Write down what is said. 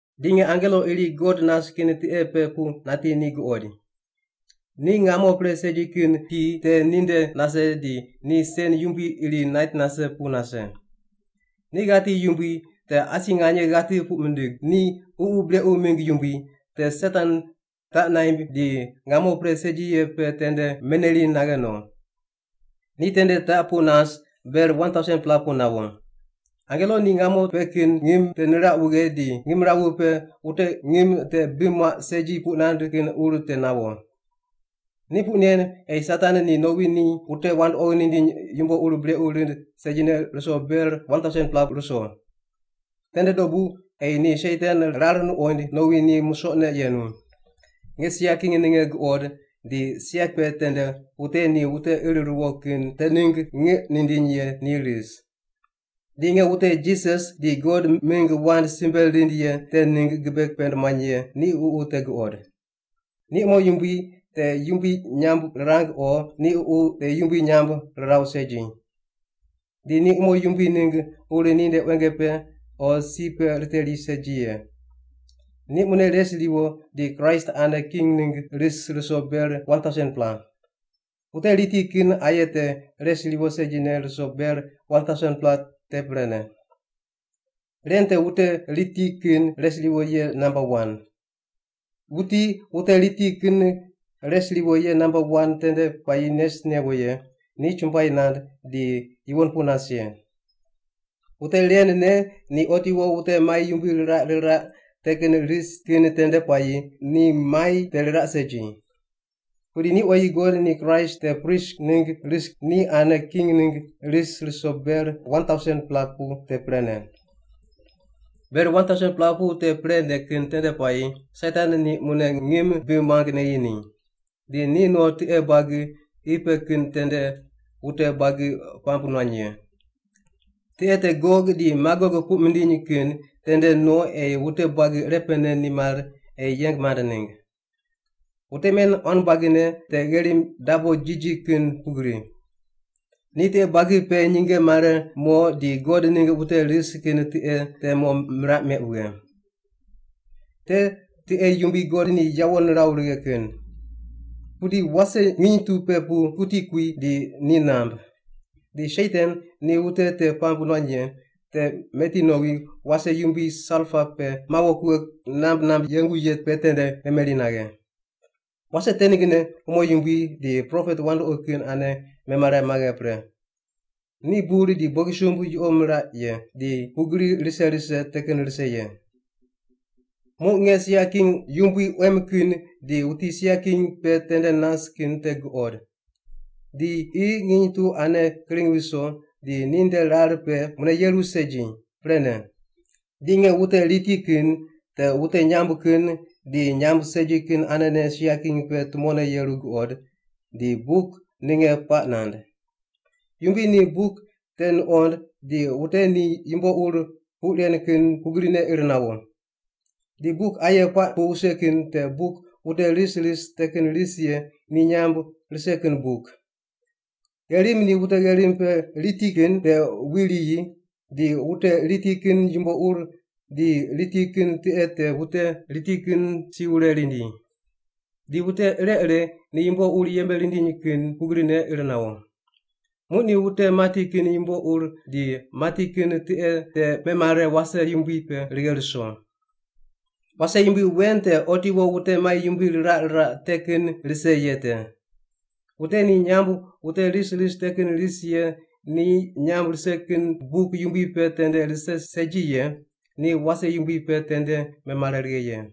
Di nge angelo iri God nas kin tiqe pe pu nati ni guqoid. Ni ngamo pre segi kin ki te ninde nase di ni sen yumbui iri nait nase pu nase. Ni ghati yumbui te asi nganye ghati puq mindig, ni ququ brequ mingg yumbui, te Satan, taq naimb di ngamo pre segi ye pe tende meneri naghe no. Ni tende taq pu nas ber 1,000-pela pu nawo. Angelo ni ngamo pe kin ngim te niraq wughe di ngimrawu pe wute ngim te bi muaq segi puq nand kin ur te nawo. Ni puq nen ei Satan ni nowi ni wute wandoqi nindiny yumbo ur brequ rind segine ruso ber 1,000-pela ruso. Tende dobu ei ni Satan rar nuqoind nowi ni musoqne yenu. Nge sia king ninge guqod di sia pe tende wute ni wute ir ruwo kin te ningg ngiq nindiny ye ni ris. Di nge wute Jisas di God mingg wand simbe rind ye te ningg gibe pend muany ye ni ququ te guqod. Ni umo yumbui te yumbui nyamb rirang o ni ququ te yumbui nyamb riraw segi. Di ni umo yumbui ningg ur ninde quenge pe o si pe riteri segi ye. Ni mune res riwo di Kraist ane king ningg ris ruso ber 1,000-pela. Wute riti kin aye te res riwo segine ruso ber 1,000-pela te prene. Ren te wute riti kin res riwo ye namba wan. Wuti wute riti kin res riwo ye namba wan tende puayi nes newo ye ni chumbuai nand di yuwon pu nas ye. Wute ren ne ni otiwo wute mai yumbui riraq riraq te kin rise kin tende puayi ni mai te riraq segi. Pudi ni oyi God di Kraist te prist ningg ris di ni ane king ningg ris ruso ber 1,000-pela pu te prene. Ber 1,000-pela pu te prene kin tende puayi Satan ni mune ngim bi muang neyi ni. Di ni no tiqe buagi qi pe kin tende wute buagi puamb nuany ye. Tiqe te Gog di Magog puq mindiny kin tende no ei wute buagi irepene nimar ei yeng mand ningg. Wute men quan buagine te gherim dabo jiji kin pugri. Ni tiqe buagi pe nyinge mare mo di God ningg wute ris kin tiqe te mo miraq meq wughe. Te tiqe yumbui God ni yawo niraw righe kin. Pudi wase nginy tu pe pu kuti kui di ni namb. Di Satan, ni wute te puamb nuany ye, te meti nowi wase yumbui salpa pe mawo kughe namb namb yengu ye pe tende memeri naghe. Wase te ninggne umo yumbui di propet wandoqi kin ane memare maghe pre. Ni bur di bogisumb yuqo miraq ye, di pugri rise rise te kin rise ye. Muq nge sia king yumbui quem kin di wuti sia king pe tende nas kin te guqod. Di qi nginy tu ane kring ruso di ninde rar pe mune yeru segi, prene. Di nge wute riti kin, te wute nyamb kin di nyamb segi kin anene sia king pe tumone yeru guqod, di buk ninge puaq nand. Yumbui ni buk te nuqond di wute ni yumbo ur puq ren kin pugrine ir nawo. Di buk aye puaq pu wuse kin te buk wute ris ris te kin ris ye ni nyamb rise kin buk. Gherim ni wute gherim pe riti kin te wi riyi ri, di wute riti kin yumbo ur di riti kin tiqe te wute riti kin si wure rindi. Di wute ire ire ni yumbo ur yembe rindiny kin pugrine ir nawo. Muq ni wute mati kin yumbo ur di mati kin tiqe te memare wase yumbui pe righe ruso. Wase yumbui wen te otiwo wute mai yumbui riraq riraq te kin rise ye te. Wute ni nyamb wute ris ris te kin ris ye ni nyamb rise kin buk yumbui pe tende rise segi ye ni wase yumbui pe tende memare righe ye.